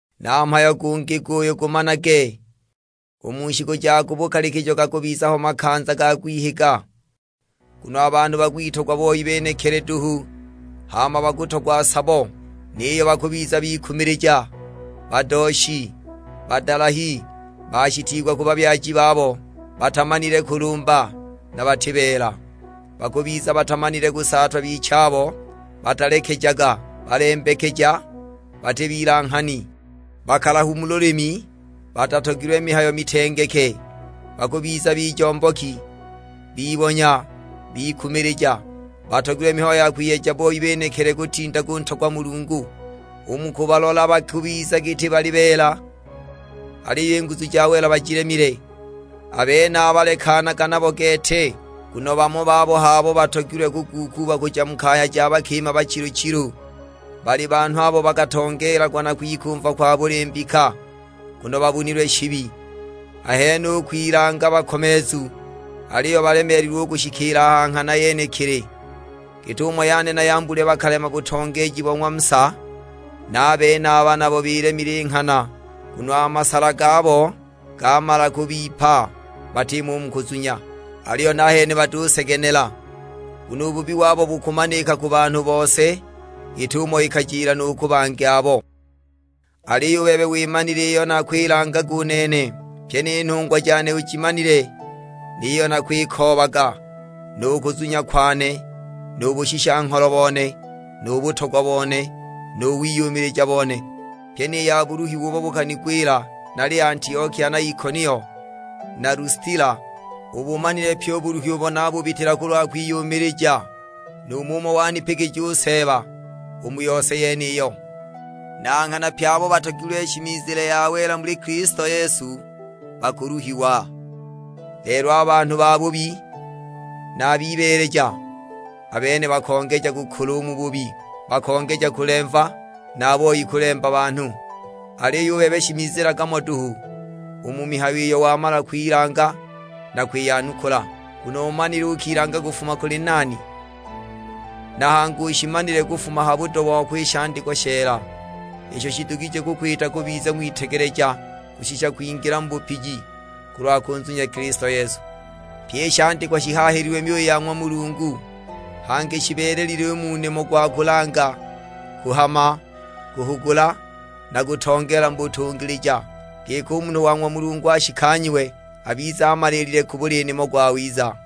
Na mhayo gungi guyu gumanage, u mu shiku ja ku bukalikijo gakubiza ho makanza ga kwihiga. Nguno a banhu bakwitogwa boi benekili duhu, hama bakutogwa sabo; niyo bakubiza bikumilija, badooshi, badalahi, bashitiigwa ku babyaji babo, batamanile kulumba, na bati beela. Bakubiza batamanile kusaatwa bichabo, batalekejaga, balembekeja, bati bilanghani, bakalahu mu lulimi, batatogilwe mihayo mitengeke. Bakubiza bijomboki, bibonya, bikumilija, batogilwe mihayo ya kwiyeja boi benekili kutinda kuntogwa Mulungu. U mu kubalola ba kubiza giti bali beela, aliyo i nguzu ja wela bajilemile. A benaba lekanaga nabo gete! Nguno bamo babo h'abo batogilwe kuguukuuba kuja mu kaya ja bakima bachilu-chilu; bali banhu abo bakatongeelagwa na kwikumva kwa buli mbika, nguno babunilwe shibi! Ahene u kwilanga bakomeezu, aliyo balemeelilwe u kushikiila a ha nghana yenekili. Git'umo Yaane na Yambule bakalema butongeeji bo ng'wa Musa; na a benaba nabo bilemile i nghana, nguno a masala gabo gamala kubipa, batimo u mu kuzunya. Aliyo nahene batusegenela, nguno u bubi wabo bukumanika ku banhu bose, git'umo ikajila nu ku bangi abo. Aliyo u bebe wimanile iyo nakwilangaga u nene, pyi ni nhungwa jane ujimanile; ni yiyo nakwikoobaga, nu kuzunya kwane, nu bushisha-ngholo bone, nu butogwa bone, nu wiyumilija bone; pyi ni ya buluhiwa ubo bukanigwila nali Antiokia na Ikonio na Lustila. Ubumanile pyi u buluhi ubo nabubitila kulwa kwiyumilija, nu mumo wanipigija u Seeba u mu yose yeniyo! Na nghana pye abo batogilwe shimizile ya wela muli Kilisto Yesu bakuluhiwa. Lelo a banhu babubi na a bibeeleja, a bene bakongeja kukula u mu bubi, bakongeja kulemva, na a boi kulemba banhu! Aliyo u bebe shimizilaga mo duhu u mu mihayo iyo wamala kwilanga na kwiyanukula; nguno umanile ukilanga kufuma kuli nani. Na hangi ushimanile kufuma ha budo wako i shandikwa sheela, isho shidugije kukwita kubiza ng'witegeleja kushisha kwingila mu bupiji, kulwa kunzunya Kilisto Yesu. Pye i shandikwa shihaahililwe myuyi ya ng'wa Mulungu, hangi shibeelelile u mu nimo gwa kulanga, kuhama, kuhugula, na kutongeela mu butungilija; giki u munhu wa ng'wa Mulungu ashikanyiwe, abize amaliilile ku buli nimo gwawiza.